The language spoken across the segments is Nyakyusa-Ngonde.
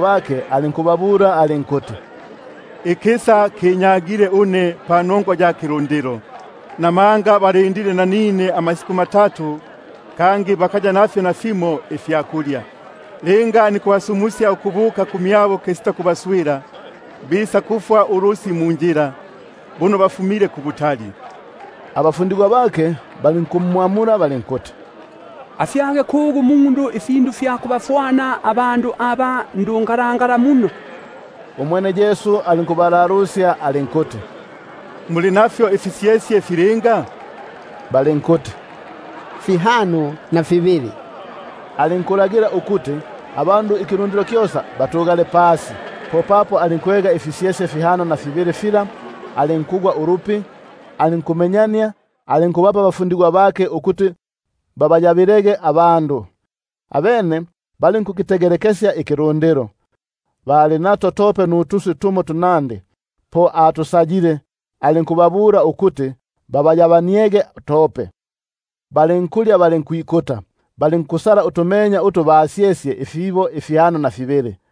bake, alinkubabula alinkuti: Ikisa kinyagile une panongwa ya kilundilo, buno balindile nanine amasiku matatu kangi bakaya nafyo nafimo ifyakulya. Linga nikubasumusya ukubuka kumyabo kisita kubaswila, bisakufwa ulusyu munjila, buno bamo bafumile kubutali. Abafundigwa bake balinkumwamula balinkuti: Afyage kugu umundu ifindu ifya kubafwana abandu aba ndukubo muno? Umwene alinkubalalusya alinkuti: Muli nafyo ifisyesye filinga? Balinkuti: Fihano na fibili. Alinkulagila ukuti abandu ikilundilo kyosa batugale pasi. Popapo alinkwega ifisyesye fihano na fibili fila, alinkugwa ulupi, alinkumenyania nukubapa abafundigwa bake ukuti babayabaniege; abene balinkukitegelekesya ikilu- ndilo. Bali nato tope nutuswi tunandi: bo atusayile, alinku- babula ukuti babayabaniege tope. Balinkulya balinkwikuta, balinkusala utumenya utu basyesye ifibo fihano na fibili.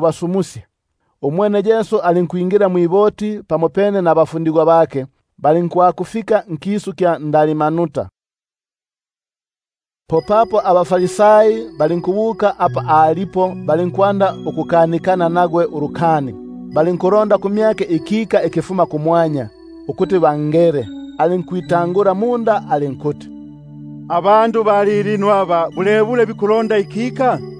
basumusya. Po umwene alinkwingila mwiboti pamopene nabafundigwa bake, balinkwakufika nkisu kya Dalmanuta. Popapo abaFarisai balinkubuka papo alipo, balinkwanda ukukanikana nagwe ulukani, balondaga kumyake ikika ikifuma kumwanya, ukuti bangele. Alinkwitangula munda alinkuti: Bulebule abandu ba lilino aba bikulonda ikika? Naloli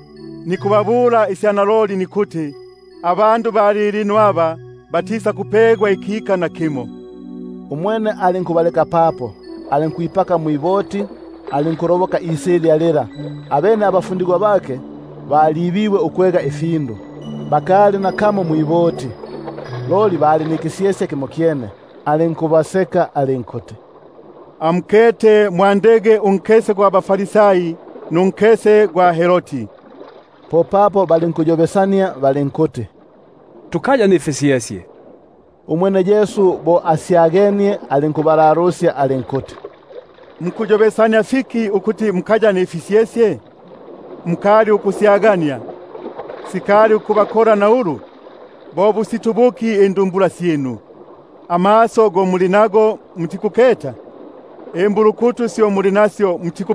nikubabula une nikuti: Abandu ba lilino aba batisakupegwa nakimo ikika. Umwene alinkubaleka papo, alinkwipaka mwiboti, alinkuloboka isilya lila. Abene abafundigwa bake balibibwe ukwega ifindu, bakali nako nakamo mwiboti, loli ikisyesye kimokyene. Alinkubasoka alinkuti: Amukete, mwandege unkese gwa baFarisai nunkese gwa Herodi. Popapo balinkuyobesania balinkuti: Kingamo papo tukaya nifisyesye! Umwene Yesu bo asya-genie, alinkubabula alinkuti: Mukuyobesania fiki ukuti mukaya nifisyesye? Mukali ukusyagania, sikali ukubakola na ulu? Bo busito buki indumbula syinu? Amaso go muli nago, mutikuketa? Imbulukutu syo muli nasyo, mutiku-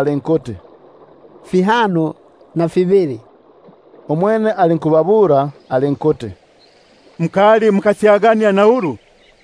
nkuti: Fihano na fibili. Umwene alinkubabula alinkuti: Mukali mukasyagania na ulu?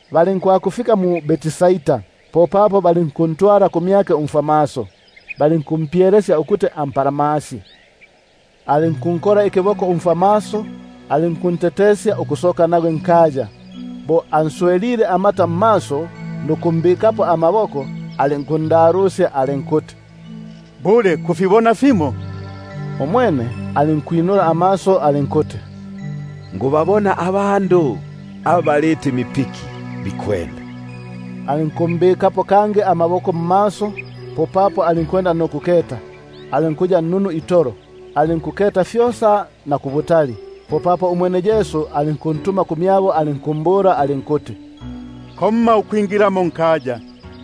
Balinkwakufika mu-Betsaida. Popapo balinkuntwala kumyake umfwamaso, balinkumpyelesya ukuti ampalamasye. Alinkunkola ikiboko umfwamaso, alinkuntetesya ukusoka nagwe nkaya; bo answelile amata mmaso nukumbikapo ama- boko, alinkundalusya alinkuti: Bule kufibona fimo? Umwene alinkwinula amaso alinkuti: Nikubabona abandu baliti mipiki, bikwenda. Alinkumbikapo kangi amaboko pamaso, popapo alinkuketa, alinkuya nnunu itolo, alinkuketa fyosa na kubutali. Umwene Yesu alinkuntuma kumyabo alinkuti: Komma ukupagukila nkaya muno.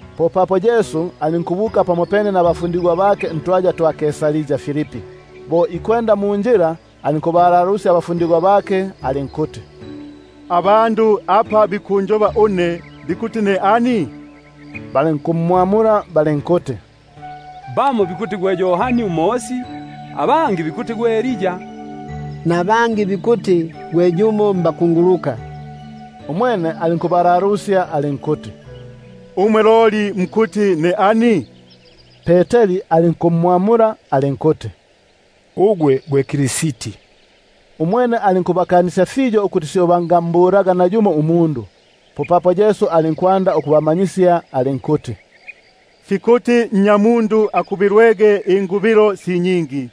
Popapo Yesu alinkubuka pamopene nabafundigwa bake ntwaya twa mu-Kaisaria Filipi. Bo ikwenda munjila alinkubalalusya abafundigwa bake alinkuti: Abandu apa bikunjoba une bikuti ne ani? Balinkumwamula balinkuti: Bamo bikuti gwe Yohani Umosi, abangi bikuti gwe Elia, nabangi bikuti gwe yumo mbakunguluka. Umwene alinkubalalusya alinkuti: Umwe loli mukuti ne ani? Peteri alinkumwamula alinkuti: Ugwe gwe Kristi. Umwene alinkubakanisya fiyo ukuti syo bangambulaga nayumo umundu. Popapo alinkwanda ukubamanyisya alinkuti: Fikuti Nnyamundu akubilwege fiyo,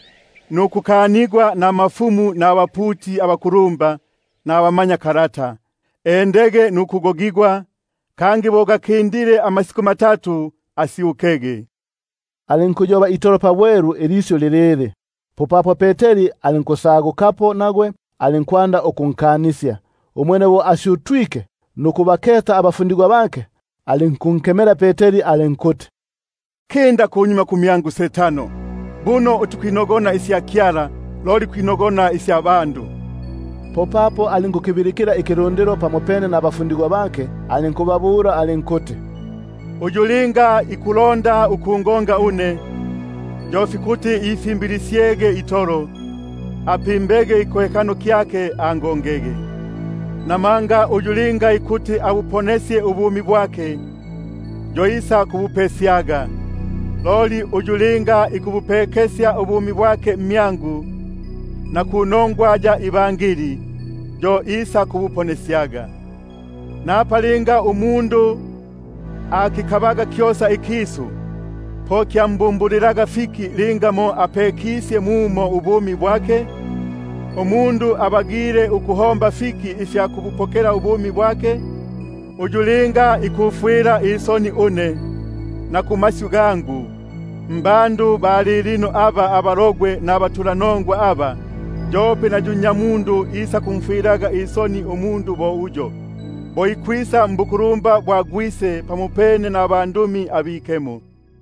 nukukanigwa nabakulumba nabaputi abakulumba nabamanyakalata, nukugogigwa, kangi bo gaki- ndile amasiku matatu asyukege. Alinkuliyoba ilisyu ili pabwelu itolo. Popapo Peteri alinkusagukapo nagwe, alinkwanda ukunkanisya. Umwene bo asyutwike nukubaketa abafundigwa bake, alinkunkemela Peteri alinkuti: Kinda kunyuma kumyangu Setano! buno utikwinogona isya Kyala, loli kwinogona si sya bandu itolo. Alinkukibilikila ikilundilo pamopene nabafundigwa bake, alinkubabula alinkuti: Uyu linga ikulonda ukwisa munyuma mmyangu, yo fikuti ikanege itolo, apimbege ikikohekano kyake, angongege. Namanga uyu linga ikuti abuponesye ubumi bwake, yo isakubutagaga; loli uyu linga ikubutagila ubumi bwake mmyangu, na panongwa ya Ibangeli, yo isaku- buponesyaga. Napa linga umundu akikabaga kyosa ikisu, po kyampaga fiki linga mo apekisye mumo itolo ubumi bwake? Umundu abagile ukuhomba fiki ifya kububangila ubumi bwake? Uyu linga ikuya nisoni kumyangu na kumasyu gangu, mbandu ba lilino abasimisi nabatulanongwa aba, yope na Nnyamundu isakuyaga nisoni kumyake, bo ikwisa mbukulumba bwa Gwise pamopene nabandumi abikemo.